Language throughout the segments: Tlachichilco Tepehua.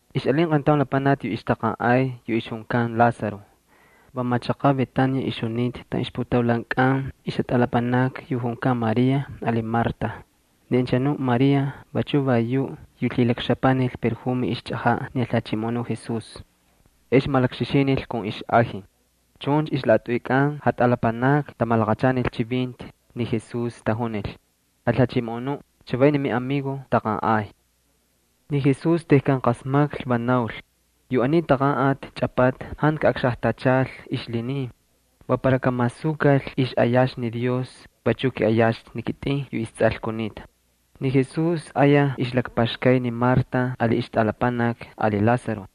Ixꞌalin qayntaun lapanaki yu ixtaqanꞌay yu ixjunkan Lázaro. Va machaqaꞌ Betania ixjunita taꞌan ixputaulankꞌan ixjatꞌalapanakni yu junkan María ali Marta. Ni anchanuꞌ María vachu va yuꞌ yu lhilakxapanil yu sꞌejenꞌe la ixchꞌajaꞌ ni Jalhachimoꞌonuꞌ Jesús ex malakxixinil kun ixꞌaji. Chuncha ixlaꞌatꞌuykꞌan jatꞌalapanakni tamalaqachanil chivinti ni Jesús. Tajunil: —Jalhachimoꞌonuꞌ, chavay ni miꞌamigo taqanꞌay. Ni Jesús tejkan qasmaklhi va naul: —Yu aniy taqanꞌati chꞌapata jantu kaꞌaqxajtachal ixlhinin. Va para kamasukal ixꞌayaxtu ni Dios, vachu kiꞌayaxtu ni kitꞌin yu isTsꞌal kunita. Ni Jesús ayaj ixlakpaxkay ni Marta ali ixtꞌalapanaki ali Lázaro.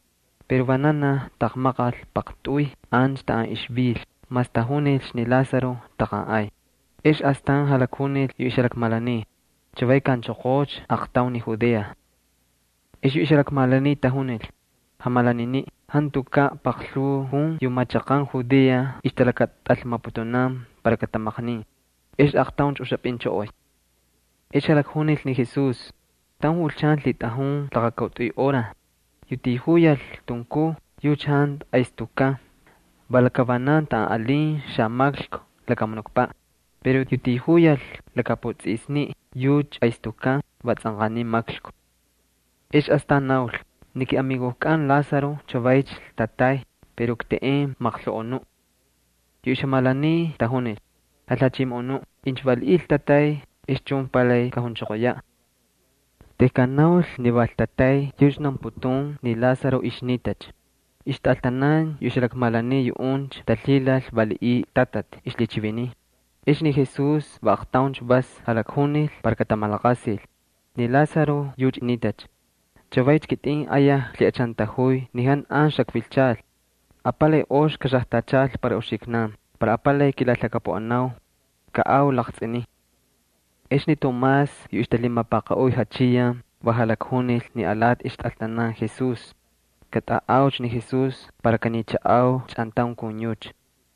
Pero vananaj taqmaqal paqtꞌuy ancha taꞌan ixvil mas tajunilcha ni Lázaro taqanꞌay. Ex astan jalakjunil yu ixjalakmalaniy: —Chavay kaꞌanchoqoocha aaqtaun ni Judea. Ex yu ixjalakmalaniy tajunil: —Jamalaniniꞌ, jantukaꞌ paqlhuu jun yu machaqan Judea ixtalakatꞌalmaputunan para katamaqnin. ¿Ex aaqtauncha uxapꞌinchꞌoꞌoy? Ex jalakjunil ni Jesús: —Taun julchan lhitꞌajun laqakautꞌuy hora. Yu tijuyal tunkuj yucha jantu aystukkan, va lakavanan taꞌan alin xamaklku lakamunukpaꞌ. Pero yu tijuyal lakaputsꞌisniꞌ yucha aystukkan, va tsꞌanqaniy maklku. Ex astan naul: —Ni kiꞌamigojkꞌan Lázaro chavaycha ltatay pero kteꞌen maqloꞌonuꞌ. Yu ixjalakmalaniy tajunil: —Jalhachimoꞌonuꞌ, incha valiꞌiy ltatay, ex chun palay kajunchoqoyaꞌ. Tejkan naul ni va ltatay yucha naunputun ni Lázaro ixnitacha. Ixtꞌaltanan yu ixjalakmalaniy, yuꞌuncha talhilal valiꞌiy ltatati ixlhichiviniy. Ex ni Jesús va aaqtauncha vas jalakjunil para katamalaqasil: —Ni Lázaro yucha nitacha. Chavaycha kitꞌin ayaj klhiꞌachantajuy ni jantu an xakvilchal. Apalay ox kaxajtachal para uxiknan para apalay kilalhakapuꞌanau. Kaꞌau laqtsꞌinin. Ex ni Tomás yu ixtalhimapaqaꞌuy Jachiyan va jalakjunil ni alati ixtꞌaltanan Jesús: —Katꞌaꞌaucha ni Jesús para kanichaꞌau chꞌantaun kun yucha.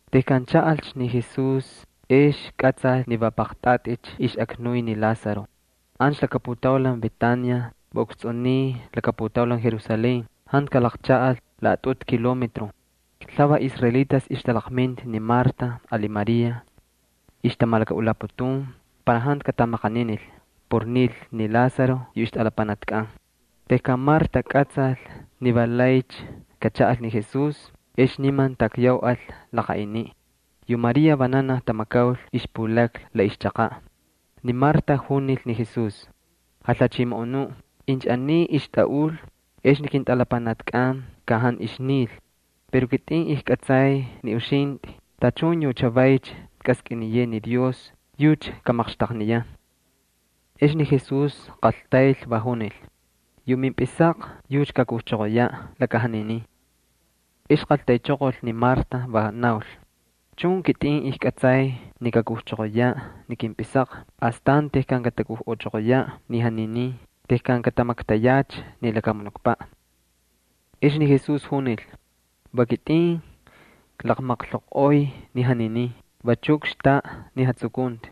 Tejkan chaꞌalcha ni Jesús ex kꞌatsal ni va paqtꞌaticha ixꞌaknuy ni Lázaro. Ancha laka putaulan Betania, va ukstsꞌuniy laka putaulan Jerusalén, jantu kalaqchaꞌal laꞌatꞌutu kilometro. Lhuvaj israelitas ixtalaqminta ni Marta ali María. Ixtamalakaꞌulaputun para jantu katamaqaninil por nil ni Lázaro yu ixtꞌalapanakkꞌan. Tejkan Marta kꞌatsal ni valaycha kachaꞌal ni Jesús, ex niman takyauꞌal laqaꞌiniꞌ. Yu María vananaj tamakaul ixpulakna la ixchaqaꞌ. Ni Marta junil ni Jesús: —Jalhachimoꞌonuꞌ, incha aniy ixtꞌaꞌul ex ni kintꞌalapanakkꞌan ka jantu ixnil. Pero kitꞌin ijkꞌatsay ni uxintꞌi, tachun yu chavaycha kꞌaskꞌiniyeꞌe ni Dios, yucha kamaqxtaqniyan. Ex ni Jesús qaltayl va junil: —Yu mimpꞌisaqa yucha kakujchoqoyaꞌ laka janinin. Ex qaltaychoqol ni Marta, va naul: —Chun, kitꞌin ijkꞌatsay ni kakujchoqoyaꞌ ni kimpꞌisaqa, astan tejkan katakujchoqoyaꞌ ni janinin, tejkan katamaktayacha ni lakamunukpaꞌ. Ex ni Jesús junil: —Va kitꞌin klaqmaqloꞌoy ni janinin, vachu kxtaꞌa ni jatsukunti.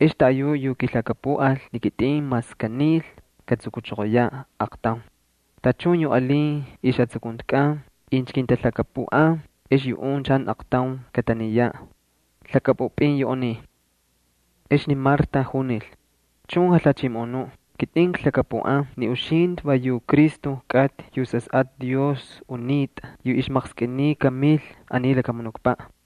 Ex taꞌayuꞌ yu kilhakapuꞌal ni kitꞌin mas kanil katsukuchoqoyaꞌ aaqtaun. Tachun yu alin ixjatsukuntikꞌan, incha kintalhakapuꞌan, ex yuꞌuncha jantu aqtaun kataniyaꞌ. ¿Lhakꞌapꞌupꞌin yu aniy? Ex ni Marta junil: —Chun, Jalhachimoꞌonuꞌ, kitꞌin klhakapuꞌan ni uxintꞌi va yu Cristo kꞌatꞌi yu Sasꞌatꞌa Dios unitꞌa yu ixmaqskꞌiniy kamil aniy lakamunukpaꞌ.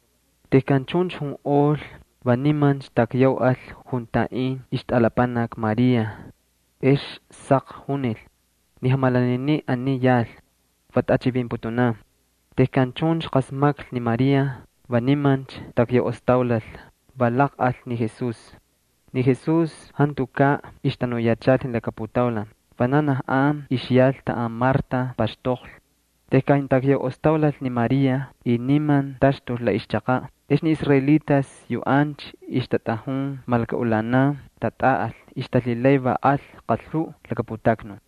Tejkan chuncha junꞌol va nimancha takyauꞌal juntaꞌin ixtꞌalapanaki María. Ex saq junil: —Ni jamalaniniꞌ aniy yal, va tꞌachivinputunan. Tejkan chuncha qasmaklhi ni María va nimancha takyauꞌostaulal, va laqꞌal ni Jesús. Ni Jesús jantukaꞌ ixtanuyachal ni laka putaulan, vananaj an ixyal taꞌan Marta paxtoqlhi. Tejkan takyauꞌostaulal ni María, y niman taxtul la ixchaqaꞌ, ex ni israelitas yu ancha ixtatꞌajun malakaꞌulanan, tatꞌaꞌal, ixtalhilay va al qalhuꞌ laka putaknun.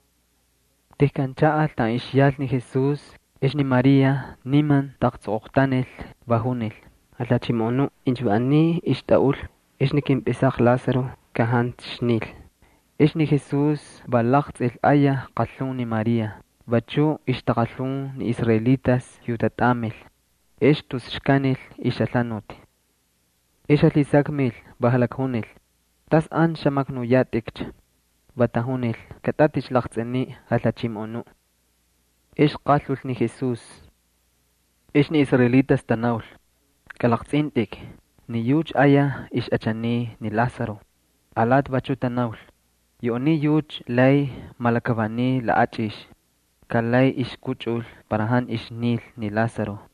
Tejkan chaꞌal taꞌan ixyal ni Jesús ex ni María niman taꞌaqtsoqoqtanil, va junil: —Jalhachimoꞌonuꞌ, incha va aniy ixtꞌaꞌul ex ni kimpꞌisaqa Lázaro ka jantu ixnil. Ex ni Jesús va laqtsꞌil ayaj qalhun ni María, vachuꞌ ixtaqalhun ni israelitas yu tatꞌamil, ex tus xkanil ixjalhanuti. Ex jalhisakmil, va jalakjunil: —¿Tas ancha xamaknuyatꞌikcha? Va tajunil: —Katꞌatꞌi laqtsꞌiniꞌ, Jalhachimoꞌonuꞌ. Ex qalhul ni Jesús. Ex ni israelitas tanaul: —Kꞌalaqtsꞌintꞌik. Ni yucha ayaj ixꞌachaniy ni Lázaro. Alati vachu tanaul: —Yu aniy yucha lay malakavaniy laꞌachꞌix. Ka lay ixkꞌuchꞌul para jantu ixnil ni Lázaro.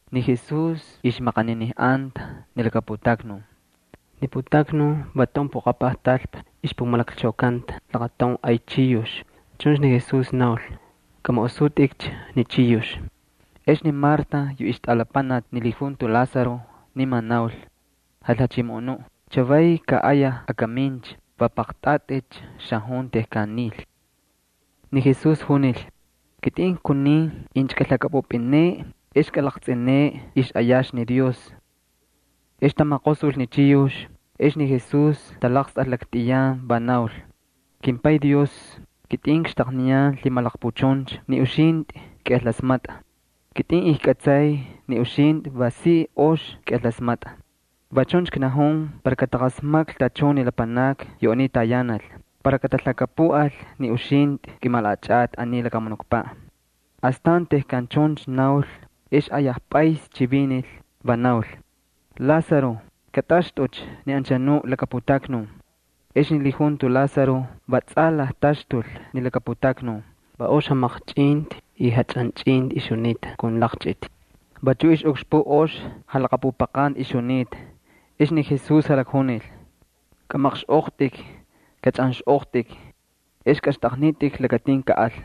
Ni Jesús ixmaqaninijꞌanta ni laka putaknun. Ni putaknun va taun poqapaj talpa ixpumalakchaukanta laqataun ay chiyux. Chuncha ni Jesús naul: —Kꞌamaꞌosutꞌikcha ni chiyux. Ex ni Marta yu ixtꞌalapanaki ni lijunto Lázaro niman naul: —Jalhachimoꞌonuꞌ, chavay ka ayaj akamincha, va paqtꞌaticha xajun tejkan nil. Ni Jesús junil: —Kitꞌin kunin incha kꞌalhakꞌapꞌupꞌineꞌe ex kꞌalaqtsꞌineꞌe ixꞌayaxtu ni Dios. Ex tamaqosul ni chiyux, ex ni Jesús talaqstꞌal laktꞌiyan, va naul: —KimPay Dios, kitꞌin kxtaqniyan lhimalaqpuchuncha ni uxintꞌi kꞌiꞌalasmatꞌa. Kitꞌin ijkꞌatsay ni uxintꞌi va si ox kꞌiꞌalasmatꞌa. Va chuncha knajun para kataqasmaklhi tachun ni lapanakni yu aniy tayanal, para katalhakapuꞌal ni uxintꞌi kꞌimalaꞌachꞌatꞌi aniy lakamunukpaꞌ. Astan tejkan chuncha naul ex ayaj pꞌays chivinil, va naul: —¡Lázaro, katꞌaxtꞌucha ni anchanu laka putaknun! Ex ni lijunto Lázaro va tsꞌalaj taxtul ni laka putaknun. Va ox jamaqchꞌinti y jachꞌanchꞌinti ixjunita kun laqchꞌiti. Vachuꞌ ixꞌukxpuꞌ ox jalaqapupaqanti ixjunita. Ex ni Jesús jalakjunil: —Kꞌamaqxꞌoqtꞌik, kachꞌanxꞌoqtꞌik, ex kꞌaxtꞌaqnitꞌik lakatin kaꞌal.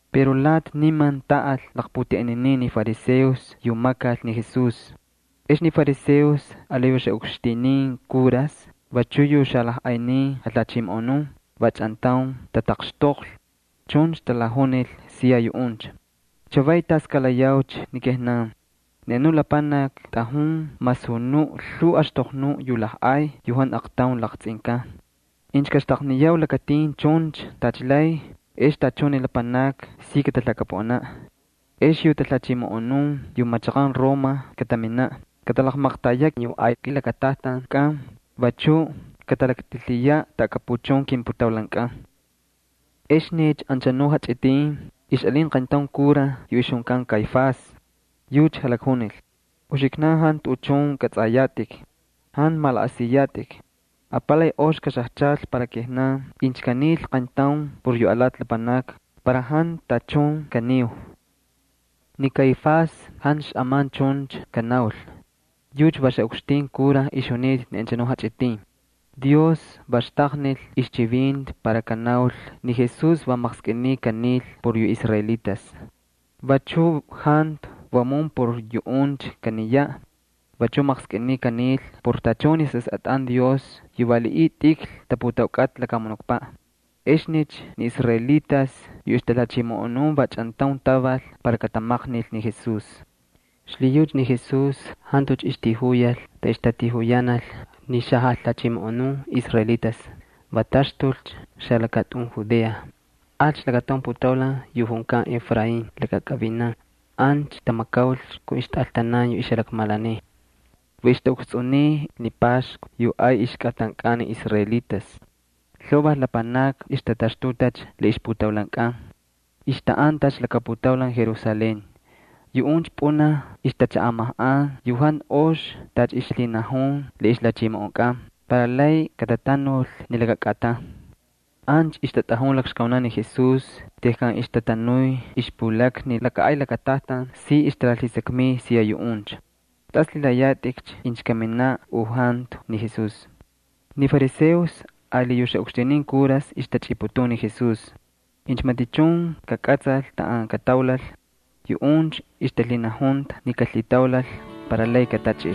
Pero lati niman taꞌal laqputeꞌeninin ni fariseos yu makal ni Jesús. Ex ni fariseos ali yu xaꞌukxtinin kuras, vachu yu xalajꞌaynin jalhachimoꞌonun va chꞌantaun tataqxtoqlhi. Chuncha talajunil siya yuꞌuncha: —¿Chavay tas kalayaucha ni kijnan? Ni anu lapanaki tꞌajun masunuꞌ lhuu axtoqnuꞌ yu lajꞌay yu jantu aqtaun laqtsꞌinkan. Incha kaxtaqniyau lakatin chuncha tacha lay ex tachun ni lapanakni si katalhakapuꞌanaꞌ. Ex yu talhachimoꞌonun yu machaqan Roma kataminaꞌ, katalaqmaqtayaꞌ yu ay kilakatajtankꞌan, vachu katalaktꞌilhiyaꞌ taꞌakapuchun kimputaulankꞌan. Exnicha anchanuꞌ jachꞌitin ixꞌalin qayntaun kuraj yu ixjunkan Caifás yucha jalakjunil: —Uxiknan jantu tuꞌuchun kꞌatsꞌayatꞌik. Jantu malaꞌasiyatꞌik. Apalay ox kaxajchal para kijnan incha kanil qayntaun por yu alati lapanakni, para jantu tachun katsꞌanqau. Ni Caifás jantu xꞌaman chuncha kanaul. Yucha va xaꞌukxtin kura ixjunita ni anchanuꞌ jachꞌitin. Ni Dios va xtaqnil ixchivinti para kanaul ni Jesús va maqskꞌiniy kanil por yu israelitas. Vachu jantu vamun por yuꞌuncha kaniyaꞌ. Vachuꞌ maqskꞌiniy kanil por tachun ni sasꞌatꞌan Dios yu valiꞌiy tꞌikl taputaukꞌata lakamunukpaꞌ. Exnicha ni israelitas yu ixtalhachimoꞌonun va chꞌantaun taval para katamaqnil ni Jesús. Xlhiyucha ni Jesús jantucha ixtijuyal taꞌan ixtatijuyanal ni xajalhachimoꞌonun israelitas. Va taxtulcha xalakatꞌun Judea, alcha lakataun putaulan yu junkan Efraín lakakꞌavinan. Ancha tamakaulcha kun ixtꞌaltanan yu ixjalakmalaniy. Va ixtaꞌukstsꞌuniy ni Paxku yu ay ixkꞌatankꞌan ni israelitas. Lhuvaj lapanakni ixtataxtutacha la ixputaulankꞌan. Ixtaꞌantacha laka putaulan Jerusalén. Yuꞌuncha pꞌunaj ixtachaꞌamajꞌan yu jantu ox tacha ixlhinajun la ixlhachimoꞌonkꞌan para lay katatanul ni laka kꞌatan. Ancha ixtatꞌajun lakxkaunan ni Jesús. Tejkan ixtatanuy ixpulakna ni laka ay lakatajtan, si ixtalalhisakmiy siya yuꞌuncha: —¿Tas lhilayatꞌikcha? ¿Kaminaꞌ u jantu? Ni fariseos ali yu xaꞌukxtinin kuras ixtachꞌiputun ni Jesús. Incha matichun kakꞌatsal taꞌan kataulal, yuꞌuncha ixtalhinajunta ni kalhitaulal para lay katachꞌil.